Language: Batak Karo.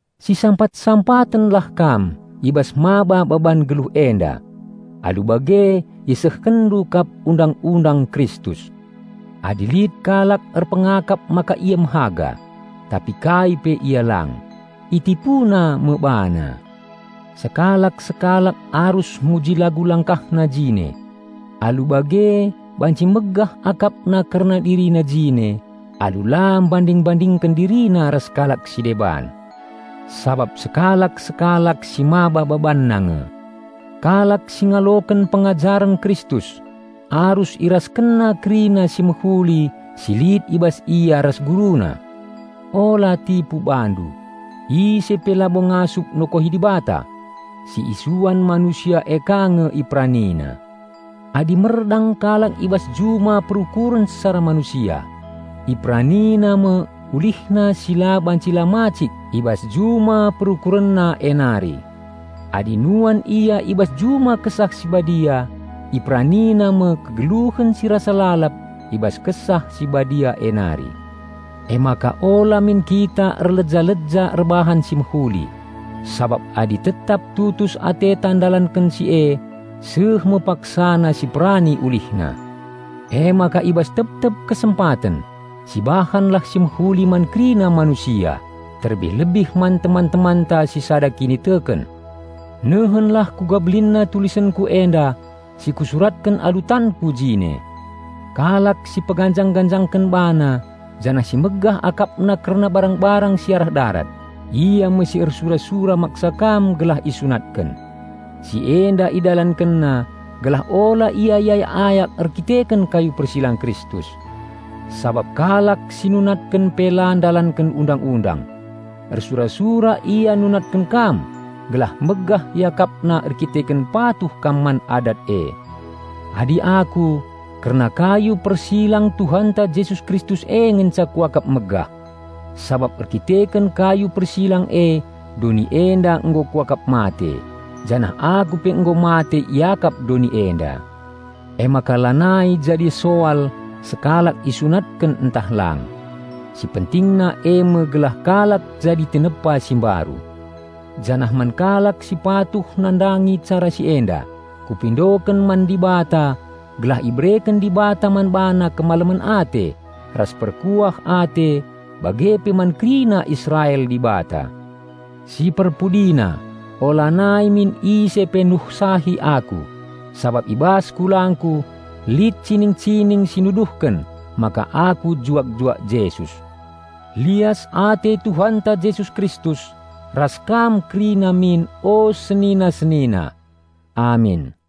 Sisampat-sampatenlah kam i bas maba baban geluh enda. Alu bage isehkenndu kap Undang-undang Kristus. Adi lit kalak erpengakap maka ia mehaga, tapi kai pe si lang, itipuna me bana. Sekalak-sekalak arus nguji lagu langkahna jine. Alu bage banci megah kerna dirina jine alu la mbanding-mbandingken dirina ras kalak si deban. Sabap sekalak-sekalak simaba babanna nge. Kalak si ngaloken pengajaren Kristus arus iraskenna kerina si mehuli si lit i bas ia ras guruna. Ula tipu bandu; ise pe labo ngasup nokohi Dibata. Si isuan manusia e ka nge iperanina. Adi merdang kalak i bas juma perukuren secara manusia, iperanina, me ulihna si la banci la macik i bas juma perukurenna e nari. Adi nuan ia i bas juma Kesah Si Badia, iperanina me kegeluhen si rasa lalap i bas Kesah Si Badia e nari. Emaka ula min kita erleja-leja erbahan si mehuli; sabap adi tetap tutus ateta ndalanken si e, seh me paksana siperani ulihna. Emaka i bas tep-tep kesempaten, sibahanlah si mehuli man kerina manusia, terlebih-lebih man teman-temanta si sada kiniteken. Nehenlah kuga belinna tulisenku enda si kusuratken alu tanku jine! Kalak si peganjang-ganjangken bana janah si megah akapna kerna barang-barang si arah darat, ia me si ersura-sura maksa kam gelah isunatken. Si enda idalankenna gelah ula ia iayak-ayak erdandanken kayu persilang Kristus. Sabap kalak si nunatken pe la ndalanken Undang-undang. Ersura-sura ia nunatken kam gelah megah iakapna erdandanken patuh kam man adat e. Adi aku, kerna kayu persilang Tuhanta Jesus Kristus e ngenca kuakap megah. Sabap erdandanken kayu persilang e, doni enda nggo kuakap mate, janah aku pe nggo mate iakap doni enda. Emaka lanai jadi soal sekalak isunatken ntah lang. Si pentingna eme gelah kalak jadi tinepa si mbaru. Janah man kalak si patuh nandangi cara si enda, kupindoken man Dibata gelah ibereken Dibata man bana kemalemen ate ras perkuah ate bage pe man kerina Israel Dibata. Si perpudina, ulanai min ise pe nuhsahi aku, sabap i bas kulangku lit cining-cining si nuduhken maka aku juak-juak Jesus. Lias ate Tuhanta Jesus Kristus ras kam kerina min o senina-senina. Amin.